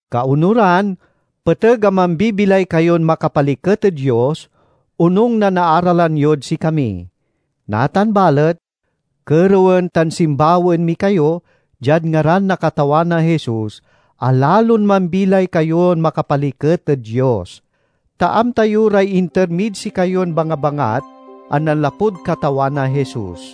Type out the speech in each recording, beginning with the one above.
Kaonuran, peteg a mambibilay kayon makapaliket ed Dios onung na naaralan yod sikami. Natan balet, kerewen tan simbawaen mi kayo diad ngaran na Katawan a Jesus, a lalon mambilay kayon makapaliket ed Dios. Ta amta yo ray inter mid sikayon bangabangat a nanlapud Katawan a Jesus.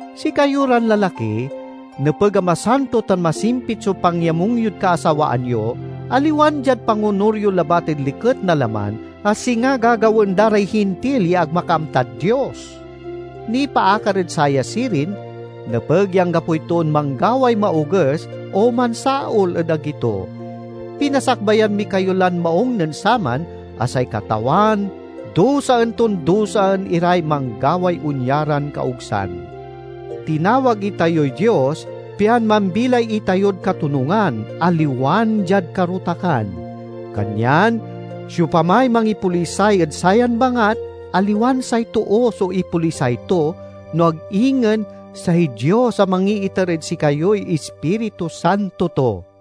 Sikayo ran lalaki, nepeg a masanto tan masimpit so pangyamung yod kaasawaan yo, aliwan diad pangonur yo labat ed liket na laman, a singa gagawaen da ray Hintil ya ag makaamtad Dios. Nipaakar ed saya sirin, nepeg ya anggapoy toon manggaway maoges o mansaol ed agi to. Pinasakbayan mi kayo lan maung nen saman, a say Katawan dusaen ton dusaen iray manggaway onya ran kaogsan. Tinawag itayoy Dios pian mambilay itayod katonungan, aliwan diad karotakan. Kanyan siopamay mangipolisay ed sayan bangat, aliwan say too so ipolisay to, no ag ingen say Dios a mangiiter ed sikayoy Ispiritu Santo to.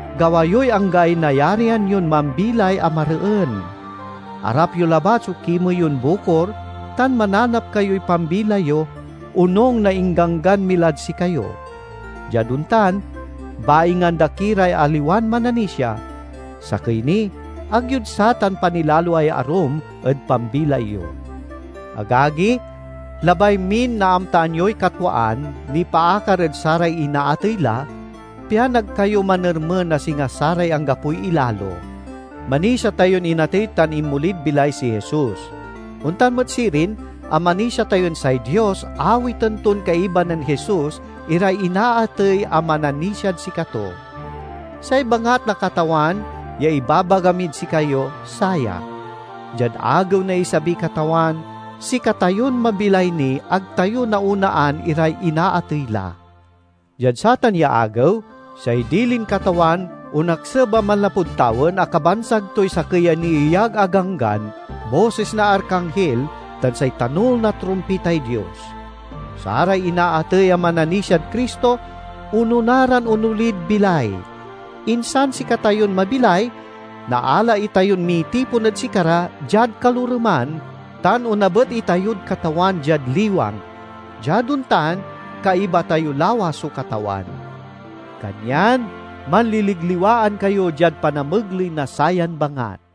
Gawa yoy anggaay nayarian yon mambilay a mareen. Arap yo labat so kimey yon bukor tan mananap kayoy pambilay yo, onung na ingganggan mi lad sikayo. Diad ontan, baingan da ki ray aliwan mananisia. Sakey ni, ag yod satan panilaloay arum ed pambilay yo. Agagi, labay min naamtaan yoy katwaan nipaakar ed saray inaatey la, pian ag kayo manermen a singa saray anggapoy ilalo. Manisia tayon inatey tan inmolid bilay si Jesus. Ontan met sirin a manisia tayon say Dios awiten ton kaiba nen Jesus iray inaatey a mananisiad sikato. Say bangat na Katawan ya ibabaga mid sikayo, saya: diad agew na isabiy Katawan, sikatayon mabilay ni ag tayo naonaan iray inaatey la. Diad satan ya agew, say dilin Katawan onakseb a manlapud tawen a kabansag toy sakey a nieyag a ganggan, bosis na arkanghil, tan say tanul na trumpitay Dios. Saray inaatey a mananisiad Cristo onona ran onolid bilay. Insan sikatayon mabilay naala itayon mitipon ed sikara diad kaloreman, tan onabet itayod Katawan diad liwang. Diad ontan, kaiba tayo lawas so Katawan. Kanyan manliligliwaan kayo diad panamegley na sayan bangat.